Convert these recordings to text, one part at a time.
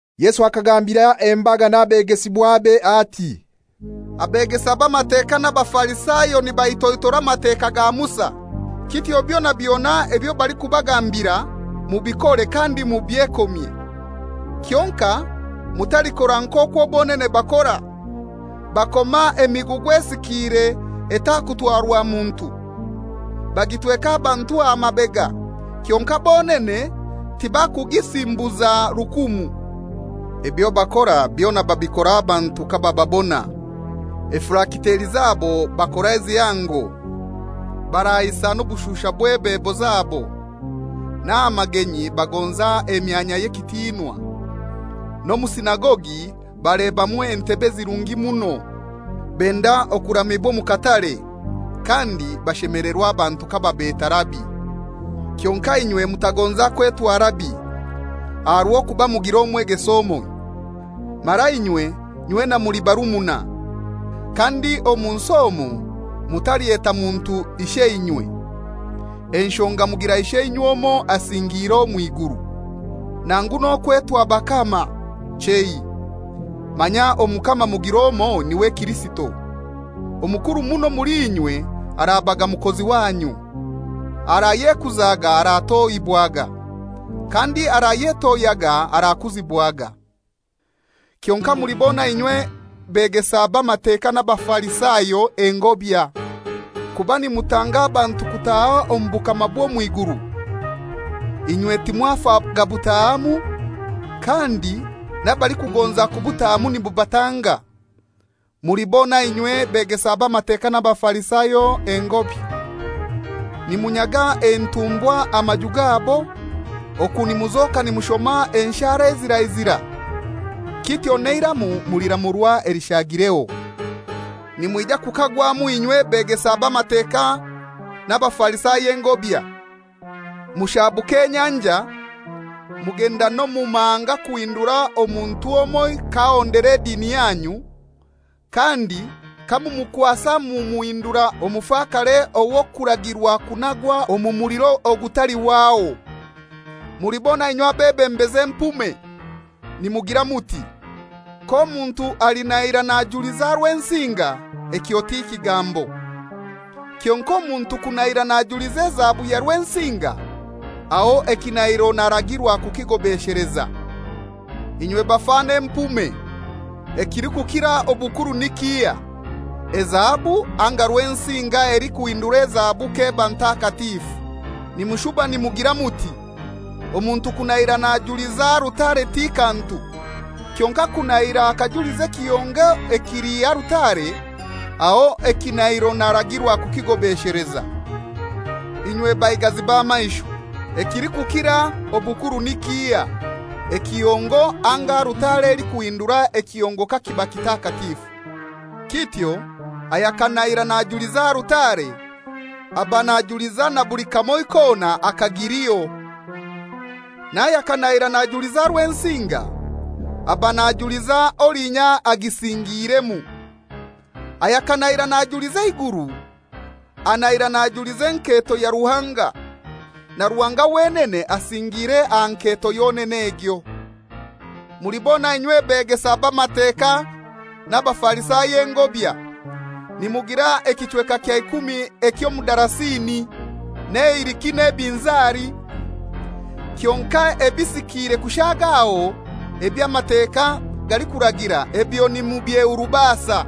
Yesu akagambira embaga n'abegesibwabe ati, «Abegesa b'Amateka n'Abafarisayo nibaitoitora Amateka ga Musa. Kityo byona byona ebyo balikubagambira mubikore kandi mubyekomye, kyonkai mutalikora nk'okwo bonene bakora. Bakoma emigugu esikiire etakutwarwa muntu, bagitweka abantu aha mabega. Kyonkai bonene tibakugisimbuza rukumu. Ebyo bakora byona babikora abantu kabababona. Efilakiteri zabo bakora ezihango, baraihisa n'obushuusha bw'ebebo zabo, n'aha magenyi bagonza emyanya ey'ekitinwa, n'omu sinagogi balebamu entebe ezirungi muno. Benda okuramibwa omu katare, kandi bashemelerwa abantu kababeta ‹Rabi.› Kyonkai inywe mutagonza kwetwa ‹Rabi,› aha rw'okuba mugira omwegesa omoi, mara inywe nywena muli barumuna. Kandi omu nsi omu mutalyeta muntu ‹Isheinywe,› enshonga mugira Isheinywe omoi asingiire omw'iguru. Nangu n'okwetwa ‹Bakama,› chei, manya Omukama mugir'omoi niwe Kirisito. Omukuru muno omuli inywe arabaga mukozi wanyu. Arayekuzaga aratohibwaga, kandi arayetohyaga arakuzibwaga.» «Kyonkai mulibona inywe begesa b'Amateka n'Abafarisayo engobya! Kuba nimutanga abantu kutaha omu bukama bw'omw'iguru; inywe timwafa gabutaahamu, kandi n'abalikugonza kubutaahamu nimubatanga. [Mulibona inywe begesa b'Amateka n'Abafarisayo engobya; nimunyaga entumbwa amaju gabo, oku nimuzoka nimushoma enshara ezirazira. Kityo n'eiramu muliramurwa elishagireho.] Nimwija kukagwamu inywe begesa b'Amateka n'Abafarisayo engobya! Mushaabuka enyanja, mugenda n'omu mahanga kuhindura omuntu omoi k'ahondera edini yanyu, kandi kamumukwasa mumuhindura omufakare ow'kuragirwa kunagwa omu muliro ogutalihwaho.» «Mulibona inywe abebembezi empume. Nimugira muti, ‹K'omuntu alinahira najuliza Rwensinga, ekyo ti kigambo; kyonkai omuntu kunahira najuliza ezahabu ya Rwensinga, aho ekinahiro naragirwa kukigobesheleza.› Inywe bafano empume! Ekilikukira obukuru ni kihai, ezahabu, anga Rwensinga elikuhindura ezahabu k'eba ntakatifu? Nimushuba nimugira muti: ‹Omuntu kunahira najuliza alutare ti kantu; kyonkai kunahira akajuliza ekihongo ekili ahali alutare, aho ekinahiro naragirwa kukigobesheleza.› Inywe baigazi b'amaisho! Ekilikukira obukuru ni kihai, ekihongo anga alutare elikuhindura ekihongo kakiba kitakatifu? Kityo ayakanahira najuliza alutare, aba najuliza na buli kamoi kona akagiliho. N'ayakanahira najuliza Rwensinga, aba najuliza olinya agisingiiremu. Ayakanahira najuliza eiguru, anahira najuliza enketo ya Ruhanga, na Ruhanga wenene asingiire aha nketo yonene egyo.» «Mulibona inywe begesa b'Amateka n'Abafarisayo engobya! Nimugira ekichweka kya ikumi eky'omudarasini, n'eiriki n'ebinzari, kyonkai ebisikiire kushagaho eby'Amateka galikuragira ebyo nimubyehurubasa: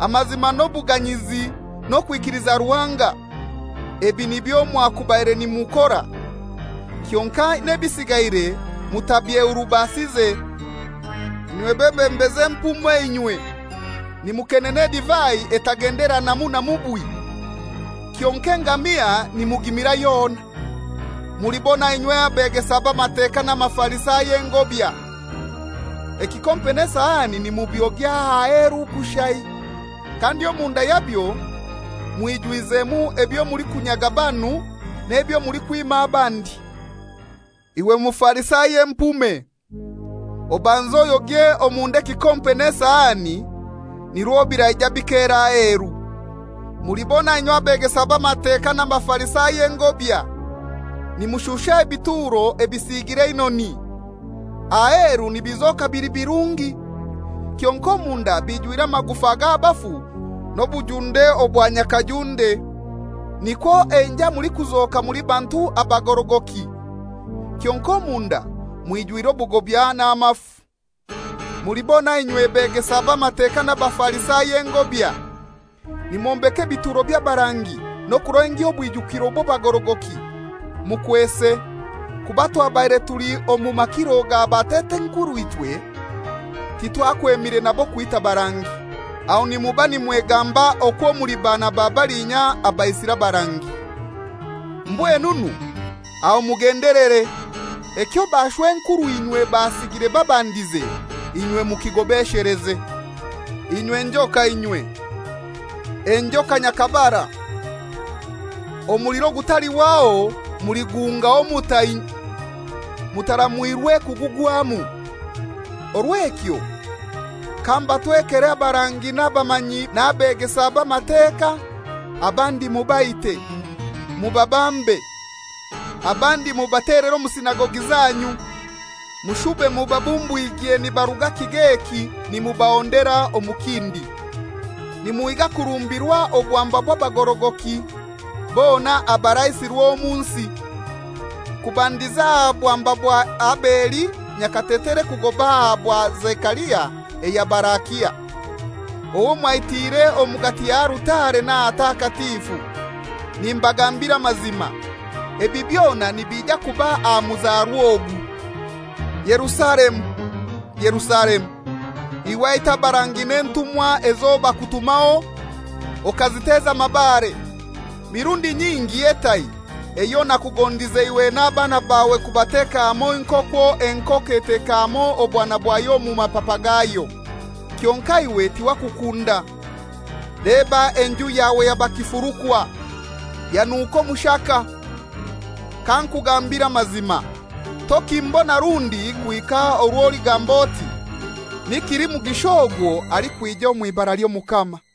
Amazima n'obuganyizi n'okwikiliza Ruhanga. Ebi nibyo mwakubaire nimukora, kyonkai n'ebisigaire mutabyehurubasize. Inywe bebembezi empume inywe! Nimukenena edivai etagenderanamu na mubwi, kyonkai engamia nimugimira yona!» «Mulibona inywe begesa b'Amateka n'Abafarisayo engobya! Ekikompe n'esahani nimubyogya aheru kushai, kandi omunda yabyo mwijwizemu ebyo mulikunyaga banu n'ebyo mulikwima abandi. Iwe Mufarisayo empume! Obanze oyogye omunda ekikompe n'esahani, nirwo biraija bikera aheru.» «Mulibona inywe begesa b'Amateka n'Abafarisayo engobya! Nimushusha ebituro ebisiigire einoni, aheru nibizoka bili birungi, kyonkai omunda bijwire amagufa g'abafu n'obujunde obwa nyakajunde. Nikwo enjai mulikuzoka muli bantu abagorogoki, kyonkai omunda mwijwire obugobya n'amafu.» «Mulibona inywe begesa b'Amateka n'Abafarisayo engobya! Nimwombeka ebituro by'abarangi n'okulengya obwijukiro bw'abagorogoki, mukwese, ‹Kuba twabaire tuli omu makiro ga batat'enkurw'ichwe titwakwemire nabo kwita barangi.› Aho nimuba nimwegamba okwo muli baana ba balinya abaisire abarangi. Mbwenunu aho mugendelere, ekyo bashw'enkurw'inywe basigire babandize inywe mukigobesheleze. Inywe njoka inywe, enjoka nyakabara; omuliro ogutalihwaho muliguhungaho mutai mutaramwirwe kugugwamu! Orw'ekyo kambatwekere abarangi n'abamanyi n'abegesa b'Amateka, abandi mubaite, mubabambe; abandi mubatelere omu sinagogi zanyu, mushube mubabumbwigye nibaruga kigo eki nimubahondera omu kindi, nimuhiga kurumbirwa obwamba bw'abagorogoki bona abaraisirwe omu nsi, kubandiza aha bwamba bwa Abeli nyakatetere kugoba aha bwa Zekaria eya Barakia, owo mwaitiire omugati ya alutare n'ahatakatifu. Nimbagambira amazima, ebi byona nibija kuba aha muzarwa ogu.» «Yerusalemu, Yerusalemu! Iwe aita abarangi n'entumwa ezo bakutumaho okaziteza amabare! Mirundi nyingi etai eyo nakugondize iwe n'abaana bawe kubateka hamoi nk'okwo enkoko eteka hamoi obwana bwayo omu mapapa gaayo, kyonkai iwe tiwakukunda! Leba enju yawe yaba kifurukwa, yanuka omushaka. Kankugambire amazima, tokimbona rundi kuhika orwo oligamba oti, ‹Ni kilimugisha ogwo alikwija omw'ibara ly'Omukama.›»